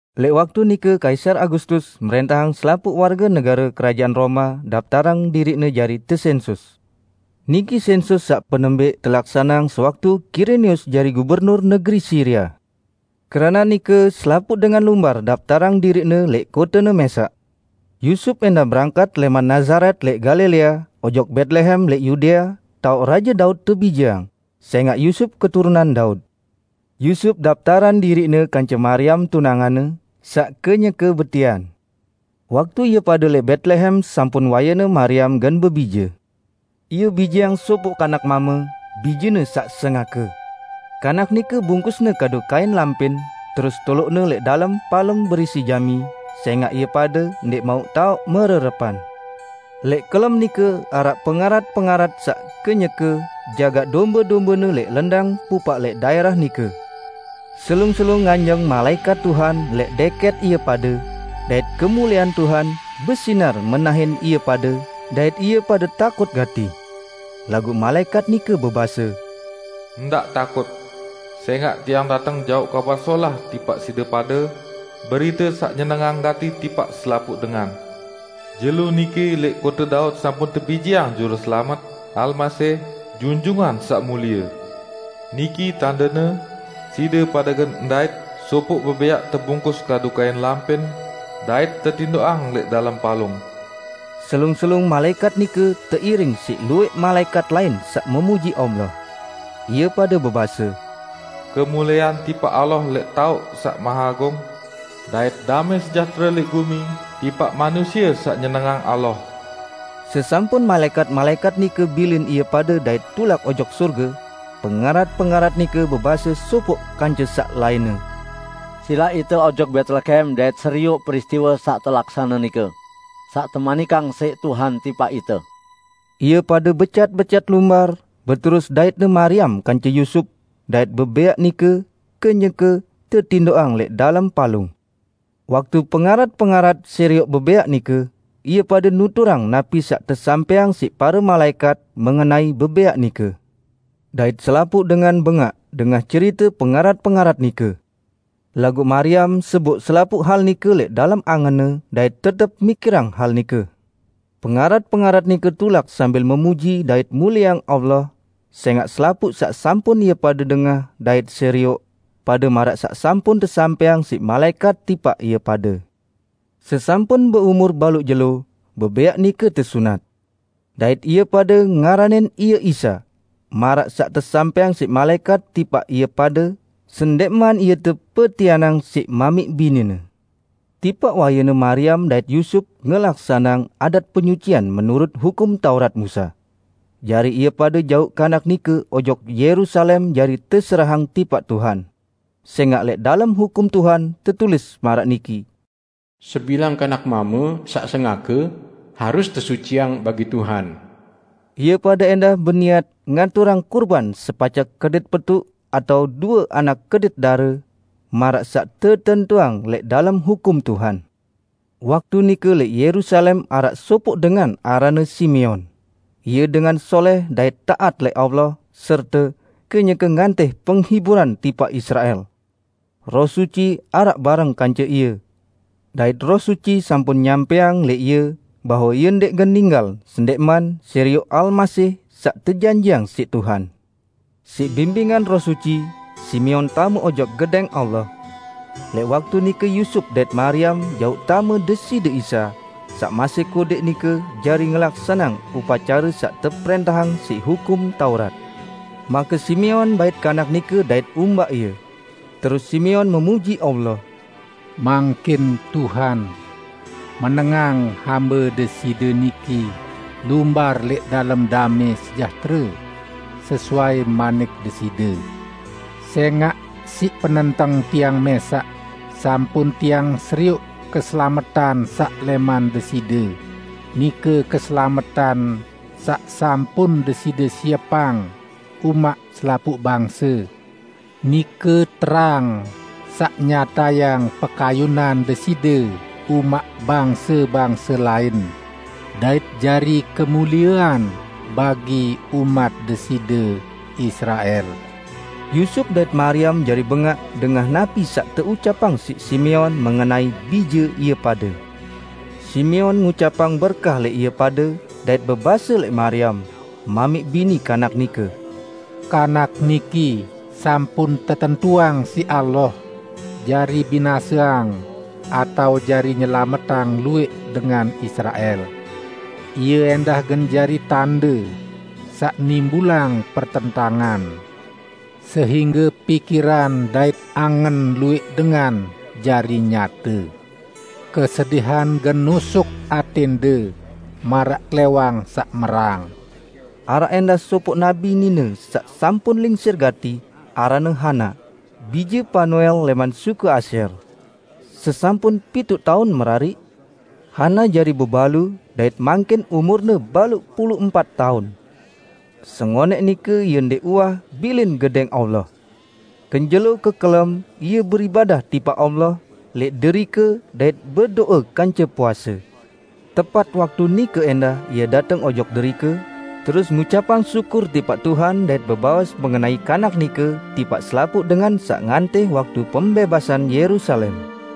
Lẽq waktu nike Kaisar Agustus mrẽntahang selapuq warge negare Kerajaan Roma daptarang diriqne jari tesensus. Niki sẽnsus saq penembẽq telaksaneang sewaktu Kirenius jari gubernur negeri Siria. Keranaq nike selapuq dengan lumbar daptarang diriqne lẽq kotene mẽsaq. Yusup ẽndah berangkat lẽman Nazaret lẽq Galilea, ojok Betlehem lẽq Yudea, taoq Raje Daud tebijeang; sẽngaq Yusup keturunan Daud. Yusup daptarang diriqne kance Mariam tunanganne, saq kenyeke betian. Waktu ie pade lẽq Betlehem sampun wayene Mariam gen bebije. Ie bijeang sopoq kanak mame, bijene saq sengake. Kanak nike bungkusne kadu kain lampin, terus toloqne lẽq dalem palung berisi jami; sẽngaq ie pade ndẽq mauq taoq mererepan. Lẽq kelem nike araq pengarat-pengarat saq kenyeke jagaq dombe-dombene lẽq lendang pupaq lẽq daẽrah nike. Selung-selung nganjeng malaẽkat Tuhan lẽq dẽkẽt ie pade, dait kemuliean Tuhan besinar menahin ie pade, dait ie pade takut gati. Laguq malaẽkat nike bebase, "Ndaq takut! Sẽngaq tiang dateng jauq kabar solah tipaq side pade -- berite saq nyenengang gati tipaq selapuq dengan. Jelo niki lẽq kote Daud sampun tebijeang Juruselamet, Almasih, Junjungan Saq Mulie. Niki tandene: Side pade gen ndait sopoq bebẽaq tebungkus kadu kain lampin, dait tetindoqang lẽq dalem palung." Selung-selung malaẽkat nike teiring siq luwẽq malaẽkat lain saq memuji Allah. Ie pade bebase, "Kemuliean tipaq Allah lẽq taoq saq maheagung! Dait damẽ sejahtere lẽq gumi tipaq manusie saq nyenengang Allah!" Sesampun malaẽkat-malaẽkat nike bilin ie pade dait tulak ojok sorge, pengarat-pengarat nike bebase sopoq kance saq lainne, "Silaq ite ojok Betlehem dait serioq peristiwe saq telaksane nike, saq temanikang siq Tuhan tipaq ite." Ie pade becat-becat lumbar, beterus daitne Mariam kance Yusup, dait bebẽaq nike kenyeke tetindoqang lẽq dalem palung. Waktu pengarat-pengarat serioq bebẽaq nike, ie pade nuturang napi saq tesampẽang siq pare malaẽkat mengenai bebẽaq nike. Dait selapuq dengan bengaq dengah cerite pengarat-pengarat nike. Laguq Mariam seboq selapuq hal nike lẽq dalem angenne dait tetep mikirang hal nike. Pengarat-pengarat nike tulak sambil memuji dait mulieang Allah, sẽngaq selapuq saq sampun ie pade dengah dait serioq, pade maraq saq sampun tesampẽang siq malaẽkat tipaq ie pade. Sesampun beumur baluq jelo, bebẽaq nike tesunat. Dait ie pade ngaranin Ie Isa, maraq saq tesampẽang siq malaẽkat tipaq ie pade, sendẽqman Ie tepetianang siq mamiq bini-Ne. Tipaq wayene Mariam dait Yusup ngelaksaneang adat penyucian menurut Hukum Taurat Musa. Jari ie pade jauq Kanak nike ojok Yerusalem jari teserahang tipaq Tuhan. Sẽngaq lẽq dalem Hukum Tuhan tetulis maraq niki, "Sebilang kanak mame saq sengake, harus tesuciang bagi Tuhan." Ie pade ẽndah beniat ngaturang kurban sepacek kedit petuq atao due anak kedit dare, maraq saq tetentuang lẽq dalem Hukum Tuhan. Waktu nike lẽq Yerusalem araq sopoq dengan aranne Simeon. Ie dengan solẽh dait taat lẽq Allah serte kenyeke ngantih penghiburan tipaq Israel. Roh Suci araq bareng kance ie, dait Roh Suci sampun nyampẽang lẽq ie bahwe ie ndẽq gen ninggal sendẽqman serioq Almasih saq tejanjiqang siq Tuhan. Siq bimbingan Roh Suci, Simeon tame ojok Gedẽng Allah. Lẽq waktu nike Yusup dait Mariam jauq tame Deside Isa, saq masih kodẽq nike jari ngelaksaneang upacare saq teprẽntahang siq Hukum Taurat. Make Simeon bait Kanak nike dait umbaq Ie, terus Simeon memuji Allah, "Mangkin Tuhan, menengang hambe Deside niki lumbar lẽq dalem damẽ sejahtere, sesuai manik Deside, sẽngaq siq penenteng tiang mẽsaq sampun tiang serioq keselametan saq lẽman Deside, nike keselametan saq sampun Deside siepang umaq selapuq bangse, nike terang saq nyatayang pekayunan Deside umaq bangse-bangse lain, dait jari kemuliean bagi umat Deside, Israel." Yusup dait Mariam jari bengaq dengah napi saq teucapang siq Simeon mengenai Bije ie pade. Simeon ngucapang berkah lẽq ie pade, dait bebase lẽq Mariam, mamiq bini Kanak nike, "Kanak niki sampun tetentuang siq Allah jari binaseang atao jari nyelametang luwẽq dengan Israel. Ie ẽndah gen jari tande saq nimbulang pertentangan, sehingge pikiran dait angen luwẽq dengan jari nyate. Kesedihan gen nusuk atẽnde maraq klẽwang saq merang." Araq ẽndah sopoq nabi nine saq sampun lingsir gati, aranne Hana, bije Panuel lẽman suku Asyer. Sesampun pituq taun merariq, Hana jari bebalu, dait mangkin umurne baluq pulu empat taun. Sengonẽq nike ie ndẽq uwah bilin Gedẽng Allah. Kenjelo-kekelem ie beribadah tipaq Allah lẽq derike dait bedo'e kance puase. Tepat waktu nike ẽndah ie dateng ojok derike, terus ngucapang syukur tipaq Tuhan dait bebaos mengenai Kanak nike tipaq selapuq dengan saq ngantih waktu pembẽbasan Yerusalem.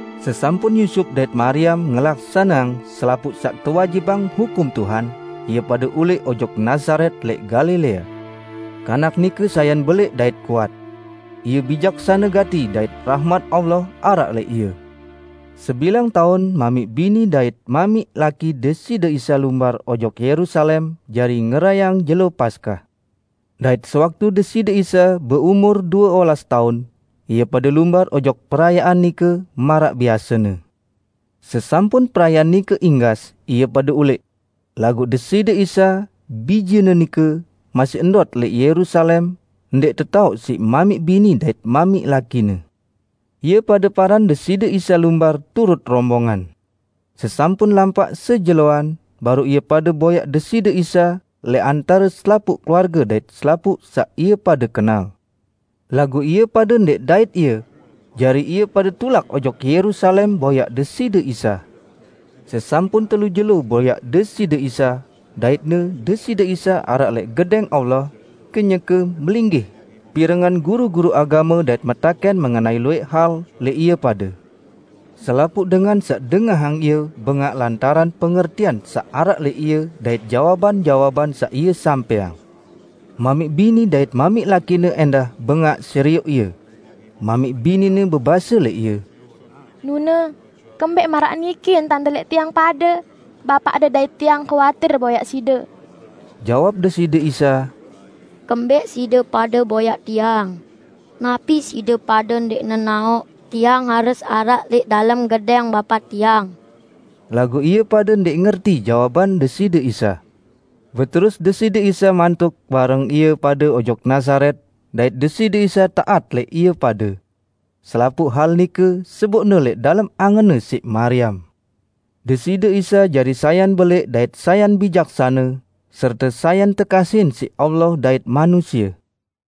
Sesampun Yusup dait Mariam ngelaksaneang selapuq saq tewajibang Hukum Tuhan, ie pade ulẽq ojok Nazaret lẽq Galilea. Kanak nike sayan belẽq dait kuat. Ie bijaksane gati dait rahmat Allah araq lẽq Ie. Sebilang taun mamiq bini dait mamiq laki Deside Isa lumbar ojok Yerusalem jari ngerayeang Jelo Paskah. Dait sewaktu Deside Isa beumur due olas taun, ie pade lumbar ojok perayaan nike maraq biasene. Sesampun perayaan nike inggas ie pade ulẽq, laguq Deside Isa, Bijene nike, masih ndot lẽq Yerusalem, ndẽq tetaoq siq mamiq bini dait mamiq laki-Ne. Ie pade paran Deside Isa lumbar turut rombongan. Sesampun lampaq sejeloan, baruq ie pade boyaq Deside Isa lẽq antare selapuq keluarge dait selapuq saq ie pade kenal. Laguq ie pade ndẽq ndait Ie, jari ie pade tulak ojok Yerusalem boyaq Deside Isa. Sesampun telu jelo boyaq Deside Isa, daitne Deside Isa araq lẽq Gedẽng Allah kenyeke melinggih pirengang guru-guru agame dait metakẽn mengenai luwẽq hal lẽq ie pade. Selapuq dengan saq dengahang Ie bengaq lantaran pengertian saq araq lẽq Ie dait jawaban-jawaban saq Ie sampẽang. Mamiq bini dait mamiq laki-Ne ẽndah bengaq serioq Ie. Mamiq bini-Ne bebase lẽq Ie, "Nune, kembẽq maraq niki entan-De lẽq tiang pade? Bapaq-De dait tiang kuatir boyaq Side!" Jawab Deside Isa, "Kembẽq side pade boyaq Tiang? Napi side pade ndẽq nenaoq Tiang harus araq lẽq dalem gedẽng Bapa Tiang?" Laguq ie pade ndẽq ngerti jawaban Deside Isa. Beterus Deside Isa mantuk bareng ie pade ojok Nazaret, dait Deside Isa taat lẽq ie pade. Selapuq hal nike seboqne lẽq dalem angenne siq Mariam. Deside Isa jari sayan belẽq dait sayan bijaksane, serte sayan tekasihin siq Allah dait manusie.